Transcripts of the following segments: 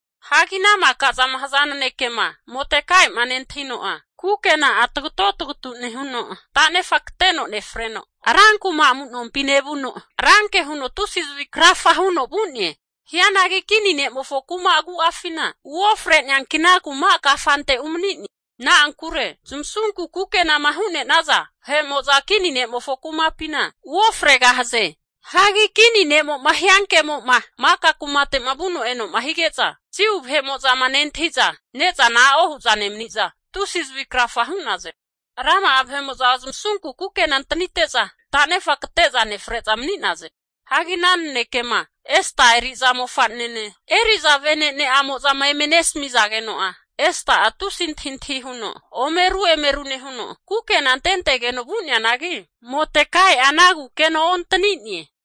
Hagi ana maka zama haza nanekema Modekai'ma nentahino'a, kukena'a tagato tagatu nehuno, tanefa kateno nefreno rankuma amu'nompi nevuno ranke huno tusi zavi krafa huno vu'ne. Hianagi kini ne'mofo kuma agu'afina uofre'neanki, ana kuma kafante umani'ne. Na'ankure zamasunku kukenama hu'ne'naza vahe'mo'za kini ne'mofo kumapina uofregahaze. Hagi kini ne'mo'ma hiankemo'ma maka kumate'ma vuno eno'ma hige'za Jiu vahe'mo'zama nentahi'za, ne'zana a'o hu'za nemani'za tusi zavi krafa hu'naze. Rama'a vahe'mo'za zamasunku kukena antanite'za tanefa kate'za nefre'za mani'naze. Hagi ana nanekema Esta eri'za mofa'nene, eri'za vene'ne'amo'zama eme nesmizageno'a, Esta'a tusi antahintahi huno ome ru emeru nehuno, kukena antentegeno vu'neanagi Modekai'a ana kukena ontani'ne.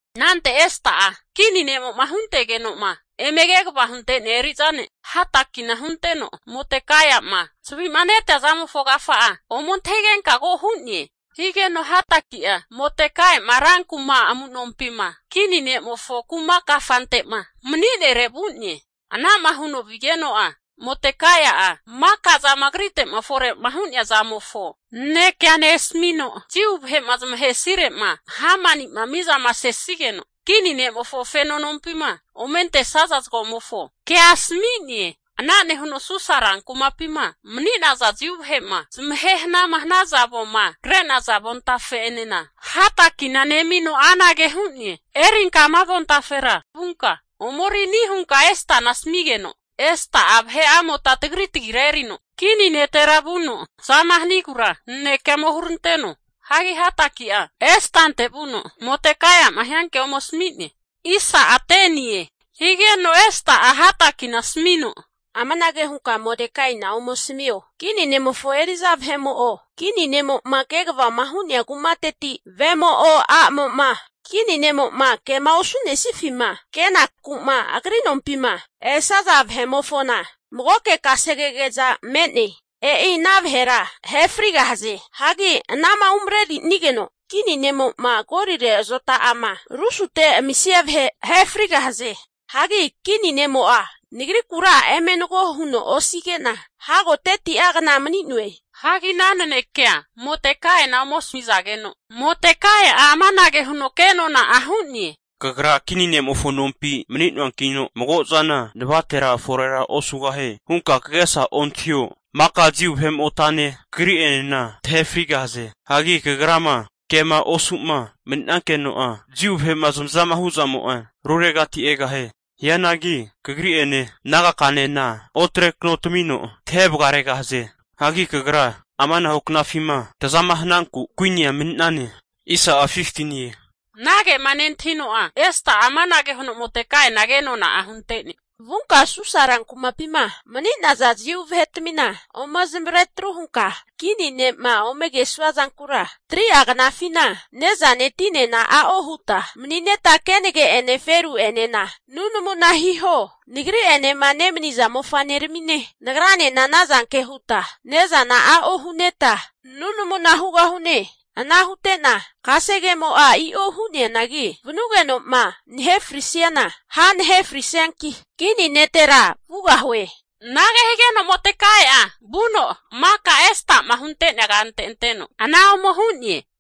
Anante Esta'a, kini ne'mo'ma huntegeno'ma eme kegavama hunte'nea eri'za ne' Hatakina hunteno, Modekaia'ma zavi'ma netea zamofo agafa'a ome antahigenka ko hu'ne. Higeno Hataki'a Modekaima rankuma amu'nompima kini ne'mofo kuma kafante'ma mani'nere vu'ne. Anama huno vigeno'a Modekai'a maka zama agrite'ma fore'ma hu'nea zamofo nanekea nesmino, Jiu vahe'ma zamahesire'ma Hamani'ma mizama sesigeno kini ne'mofo feno nompima ome antesaza zagomofo kea asami'ne. Ana nehuno Susa rankumapima mani'naza Jiu vahe'ma zamahe hana'ma hanaza avoma kre'naza avontafe'enena Hatakina nemino anage hu'ne, erinka ama avontafera vunka omeri ani hunka Estana asmigeno, Esta'a vahe'amota tagri tagira erino kini netera vuno tazama hanigura nanekea ome huranteno. Hagi Hataki'a Estante vuno Modekai'ma hiankea ome asmi'ne. Higeno Esta'a Hatakina asmino, Amanage hunka Modekaina ome asmio. Kini ne'mofo eri'za vahe'mo'o, kini ne'mo'ma kegavama hu'nea kumateti vemo'o a'mo'ma, kini ne'mo'ma kema osunenifima kenaku'ma agri nompima esaza vahe'mofona magoke kasegege'za me'ne. E'i ana vahera ahe frigahaze. Hagi anama umrenerinigeno kini ne'mo'ma gorire azota'ama rusute amisia vahe ahe ofrigahie. Hagi kini ne'mo'a nagrikura eme nago huno osige'na hago 30'a kna mani'noe. Hagi ana nanekea Modekaina ome asamizageno, Modekai'a amanage huno kenona'a hu'ne. Kagra kini ne'mofo nompi mani'noankino mago zana navatera forera osugahie hunka kagesa ontahio. Maka Jiu vahe'motane kagri'enena tahe frigahaze. Hagi kagrama kema osuma mani'nankeno'a, Jiu vahe'ma zamazama hu'zamo'a ruregati egahie. Hianagi kagri'ene nagakanena otrekano tamino tahe vagaregahaze. Hagi kagra amanahu knafima tazama hananku kuinia mani'nane. Anagema nentahino'a, Esta'a amanage huno Modekaina kenona hunte'ne, Vunka Susa rankumapima mani'naza Jiu vahetmina ome zamavare atru hunka kini ne'ma ome kesuazankura 3'a knafina ne'zane tinena a'o huta mani'neta kenage'ene feru'enena nunamuna hiho. Nagri'enema nemaniza mofa'neramine nagranena anazanke huta ne'zana a'o hu'neta nunamuna hugahune. Ana hute'na kasegemo'a i'o hu'neanagi, vanugeno'ma nahe frisiana ha nahe frisianki, kini netera vugahue. Anage higeno Modekai'a vuno maka Estama huntea kante anteno ana ome hu'ne.